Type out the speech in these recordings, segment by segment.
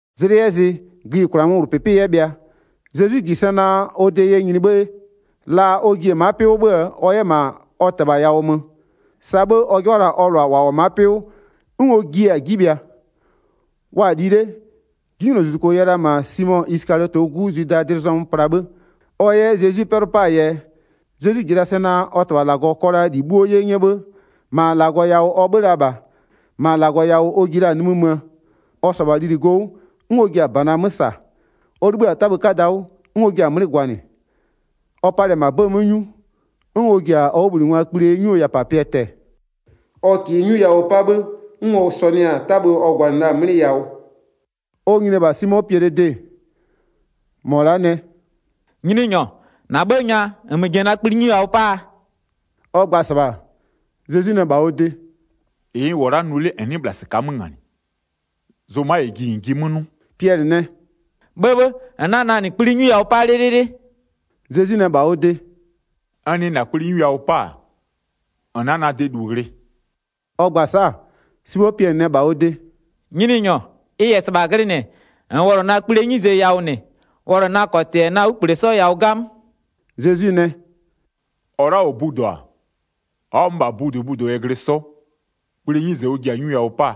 Zlɩ 'yɛ zɩ gïyikwlaa 'möwlʋpɩpɩ 'yɛ bhɩa, Zezwi -ji sɛ naa ɔ de yɛ nyini 'bhë, la ɔ ji-e ma'a 'pɩ 'wʋ 'bhö-ö ɔ 'yɛ -ma ɔ -Tɩbha yawʋ mö. Sa 'bhë ɔ 'jɩbha la-a ɔ -lʋa -wa -wʋ-ɔ ma'a 'pɩ 'wʋ, 'n ɔ jiɩ-a 'ji bhɩa. Wa-a li 'le, 'Jinylozuzuko yɛ la -ma Simo Isɩkaliɔtɩɛ 'gu Zwidaa dlɩ zɔmö pla 'bhë ɔ 'yɛ Zezwi 'pɛlʋ 'paa yɛ. Zezwi -ji la sɛ naa ɔ -Tɩbha -Lagɔ kɔ la -li 'bhuo 'ye 'nyɛ 'bhë, -ma -Lagɔ yawʋ ɔ 'bhö-ö la -bha, -ma -Lagɔ yawʋ ɔ ji la-a nimï möö. Ɔ -sɔ-ɔ -bha lili go 'wʋ, 'n ɔ ji-a -bana 'mö -sa. Ɔ 'libhï-a 'tabhë 'kada 'wʋ, 'n ɔ jia-a 'mlɩ gwanɩ. Ɔ palɩ-ɛ -ma 'bëë 'mö 'nyu, 'n ɔ ji-a ɔ 'wʋbhlinɩngwaa kpli 'nyuo yawʋpapɩɛ tɛ-ɛ, ɔ -kɩɩ 'nyu yawʋ 'pa 'bhë, 'n ɔ sɔnʋɩ-a 'tabhë ɔ gwanɩ la-a 'mlɩ yawʋ. Ɔ nyini-e -bha Simo Piɛlɩɛ de, -mɔ la'a nɛ: “Nyininyɔ, -na 'bhë nya, -nmö ji-e na kpli 'nyu yawʋ 'paa?” Ɔ gba-a -sɩbha, Zezwi nɛ -bha ɔ de: “-Ɩ n -wʋ-ɔ la'a nʋ 'le, -n 'nɩɩ -bhla -sɩka'a 'mö -nganɩ, zʋma -yɛ ji -n jiɩ 'mö 'nʋ.” Piɛlɩ nɛ: “'Bhëbhë, -n 'na na -nɩ kpli 'nyu yawʋ 'pa 'lɩlɩlɩ.” Zezwi nɛ -bha ɔ de: “N nɩ -na kpli 'nyu yawʋ 'pa-a, -n 'na na de -lu ghlɩ.” Ɔ gba-a sa'a, Simo Piɛlɩ nɛ -bha ɔ de: “Nyininyɔ, ɛ -yɛ -sɩbha glɩnɩ, -nn wɔlʋ na kplie 'nyize yawʋ -nɩ, wɔlʋ na -kɔtɩ -yɛ na 'wlukple 'sɔ yawʋ 'gamö.” Zezwi nɛ: “-Ɔ la'a -ɔ budo-a, ɔ'ɔ-a 'mö -bha budobudo yɛ glɩ 'sɔ, kplie 'nyize ɔ ji-a 'nyu yawʋ 'paa,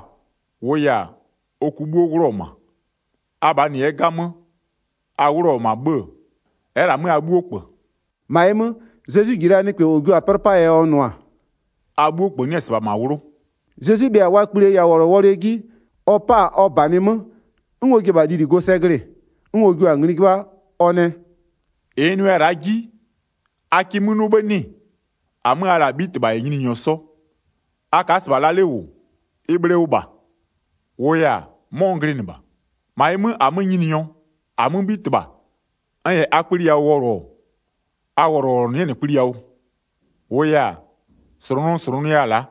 -wʋʋ yɛ-a, ɔ ku 'bhuo 'wlʋɔ-ɔ -ma. Abhaa -nɩ 'yɛ 'gamö, a 'wlʋɔ-ɔ -ma 'bhë, ɛ'ɛ -lɛ-a 'mö a 'bhuo -kpö.” 11-Ma ɩ 'mö, Zezwi -ji la nɩkpɛ -ɔ jio la-a 'pɛlʋ 'paa yɛ ɔ nʋ-a: “A 'bhuo -kpö 'nɩ-ɛ -sɩbha -ma 'wlʋ.” Zezwi bhɩa-a wa kplie yawʋwɔlʋwɔlʋɛ 'ji-e, ɔ 'pa-a ɔ -banɩ 'mö, 'n ɔ ji-e -bha lili go sɛ glɩ-ɩ. 'N ɔ jua-a ngli 'jɩbha, ɔ nɛ: “-Ɩ n nʋya-a la'a 'ji, a kɩ 'mö 'nʋ 'bhë 'nɩ-ɩ? 13-Amö a la-a -Abhitɩbha -yɛ Nyininyɔ 'sɔ, a ka'a -sɩbha la 'le -wʋ, ɩ bhle wʋ -bha, -wʋʋ yɛ-a, 'mɔ n glɩnɩ -bha. 14-Ma ɩ 'mö, -amö Nyininyɔ, -amö 'Bhitɩbha, n -yɛ a kpli yawʋ wɔlʋ-ɔ, a wɔlʋwɔlʋnʋ 'yɛ -nɩ kpli yawʋ. 15-Wʋʋ yɛ-a, -slʋnʋ n slʋnʋya-a la'a,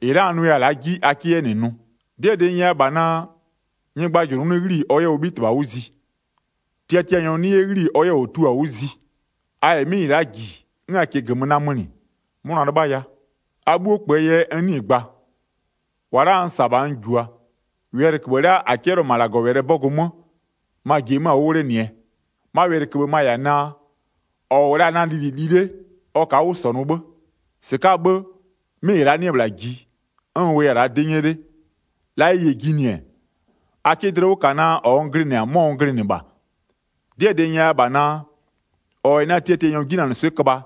-ɩ la'a n nʋya-a la'a 'ji a 'kɩ 'yɛ -nɩ nʋ. 'Dɩɛ -dɩ n nyɛya -bha naa: Nyɩgbajʋlʋ 'nɩ 'ghli-i ɔ 'yɛ ɔ 'bhitɩbha 'wʋ zi, tiatianyɔ 'nɩ 'yɛ 'ghli-i ɔ 'yɛ -ɔ tio-a 'wʋ zi. A -yɛ 'mɩ -ɩ la'a -ji, 'n a -kɩɩ -gömö namönɩ, 'mʋna 'lɩbhaya. A 'bhuo -kpöö yɛ n 'nɩɩ-ɩ gba, -wa n -sa-a -bha n -jua. Wɛlɩköbhë la'a -a 'cɛlɩɔ-ɔ -ma -Lagɔwɛlɩɛ 'bɔgʋ 'mö, ma-a ji-e 'mö-a 'wʋ 'wlenɩɛ. 'Ma wɛlɩköbhë ma -yɛ-a naa: -Ɔ -wʋ la-a na lili li 'le, ɔ ka'a 'wʋ -sɔnʋ 'bhë. 19-Sɩka'aa 'bhë, 'mɩ -ɩ la'a 'nɩ-ɛ -bhla ji, 'n n wʋya-a la'a 'dɩ 'nyɛ 'le, la ɩ -yɛ jinɩ-ɛ, a 'kɩ dlɩ 'wʋ -ka naa -ɔ n glɩnɩ-a, 'mɔ n glɩnɩ -bha. 'Dɩɛ -dɩ n nyɛya -bha naa: -Ɔ -yɛ na tiatianyɔ 'jinanɩswɩ'ɩ köbha,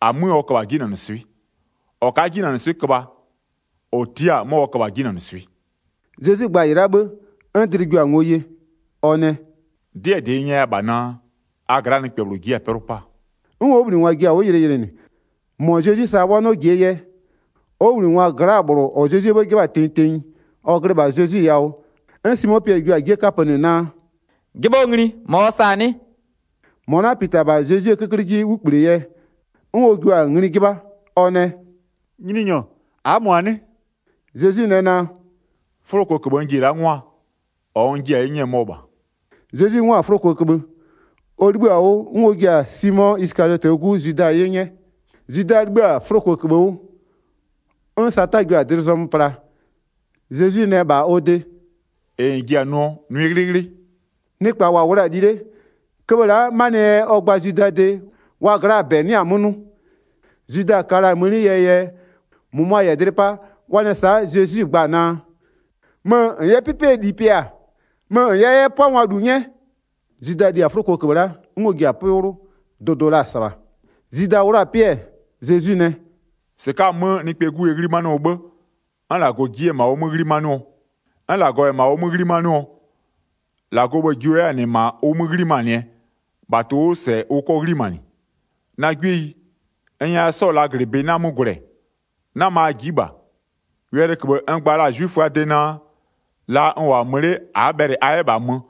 -amö ɔ köbha-a 'jinanɩswɩ'ɩ. -Ɔ ka'a 'jinanɩswɩ'ɩ köbha, -ɔ tia'a-a 'mɔ ɔ köbha-a 'jinanɩswɩ'ɩ.” Zezwi gba-a -ɩ la'a 'bhë, 'n dlɩ jio-a ngo ye. Ɔ nɛ: “'Dɩɛ -dɩ n nyɛya -bha naa, a gla'aa nɩkpɛ -bhlʋ ji'i-a 'pɛlʋ 'paa.” 'N ɔ 'wʋbhlinɩngwa ji-a 'wʋ yɩlɩyɩlɩnɩ, -mɔ Zezwi sa wa 'nɩɔ -jie yɛ. Ɔ 'wʋbhlinɩngwa gla'aa -bhlʋ -ɔ Zezwie 'bhë 'jɩbha-a tenyi tenyi, ɔ glɩ -bha Zezwi yawʋ. 'N Simo Piɛlɩ jio-a 'jie 'kapönɩ naa: “'Jɩbhɔ ngli -mɔ ɔ sa-a 'nɩ?” 25-Mɔ la'a pita-a -bha Zezwie 'köklɩ 'ji 'wlukple yɛ, 'n ɔ jio-a ngli 'jɩbha: Ɔ nɛ: “Nyininyɔ, a'a -mɔ-a 'nɩ?” Zezwi nɛ naa: “'Fʋlokoköbhë n ji-e la'a 'ngwaa, -ɔ n jia-a 'ye 'nyɛɛ mɔ -bha.” Zezwi 'ngwa-a 'fʋlokoköbhë, ɔ 'libhïa-a 'wʋ, 'n ɔ jia-a Simo Isɩkaliɔtɩɛ 'gu Zwida 'ye 'nyɛ. Zwida 'libhï-a 'fʋlokoköbhë 'wʋ, 'n Sata jio-a dlɩ zɔmö pla. Zezwi nɛ -bha ɔ de: “-Ɩ -n ji-a nʋɔ, nʋɩ 'ghlɩghlɩ.” Nɩkpa -wa -wʋ la-a li 'le, köbhë la'a, 'manɩɛ yɛ ɔ gba-a Zwidaa de, wa gla'aa -bɛ 'nɩa-a 'mö 'nʋ. Zwida ka la-a mëni yɛɛ yɛ, -mʋmʋa -yɛ dlɩ 'pa wa nɛ sa'a Zezwi gba-a naa: “Mö -n 'yɛ 'pɩpɩɛ -li pɩa, mö 'yɛ -n 'yɛ 'pʋangwa -lu 'nyɛ.” Zwida li-a 'fʋlokoköbhë la'a 'gamö, 'n ɔ ji-a 'pɩ 'wlʋ. Dʋdʋ la-a -sɩbha. Zwida 'wlʋ-a 'pɩ-ɛ, Zezwi nɛ: “-Sɩka'a-a 'mö Nɩkpɛɛ 'Gu yɛ 'ghlimanɩɔ 'bhë, 'n -Lagɔ ji 'yɛ-ɛ -ma ɔ 'mö 'ghlimanɩɔ. 'N -Lagɔ -yɛ -ma ɔ 'mö 'ghlimanɩɔ, -Lagɔɔ bhë-ë jio 'yɛ-a -nɩ -ma ʋ 'mö 'ghlimanɩɛ, -bha tʋ-ʋ 'wʋ -sɛ ʋ 'kɔ 'ghlimanɩ. Na 'gwieyi, n nyɛya 'sɔɔ -laaglɩbɩ 'na 'mö gwlɛ. 'Nama a ji'i -bha, wɛlɩköbhë n gba la-a 'zwiföaa de naa: La n -wʋ-a mö 'le a'a bhɛlɩ a 'yɛ -bha mö,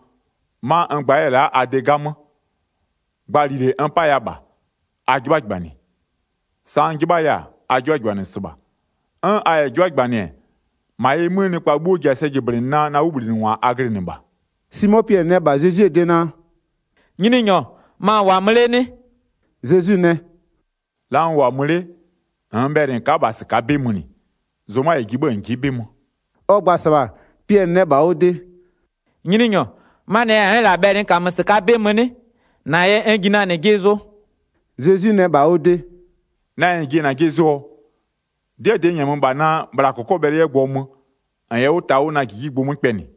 'ma n gba 'yɛ-ɛ la'a a de 'gamö. Gba -lile n 'paya -bha: A 'jɩbhajɩbhanɩ. Sa n 'jɩbhaya-a, a 'jɩbhajɩbhanɩ -sɩbha. 'N a -yɛ 'jɩbhajɩbhanɩ-ɛ, -ma ɩ 'mö nɩkpa 'bhuo ji-a sɛ jɩblɩnɩɛ naa na 'wʋbhlinɩngwa a glɩnɩ -bha.” Simo Piɛlɩ nɛ -bha Zezwie de naa: “Nyininyɔ, ma -n -wʋ-a mö 'le 'nɩ?” Zezwi nɛ: “La n -wʋ-a mö 'le, -nn bhɛlɩ -n ka'a -bha -sɩka'a 'bɩ mönɩ, zʋma -yɛ ji -n ji'i 'bɩ mö.” Ɔ gba-a -sɩbha, Piɛlɩ nɛ -bha ɔ de: “Nyininyɔ, 'manɩɛ yɛ n'n -lɛ-a bhɛlɩ n -kamö -sɩka'a 'bɩ mö 'nɩ? -Na yɛ n ji na -nɩ jɩ zʋ.” Zezwi nɛ -bha ɔ de: “Na yɛ -n ji-e -najɩ zʋɔ? 'Dɩɛ -dɩ n -nyɛmö -bha naa, bhla -kɔkɔbhɛlʋ 'yɛ gbʋɔ mö, -n yɛ 'wʋ ta na -jijigbʋ 'mö kpɛnɩ.”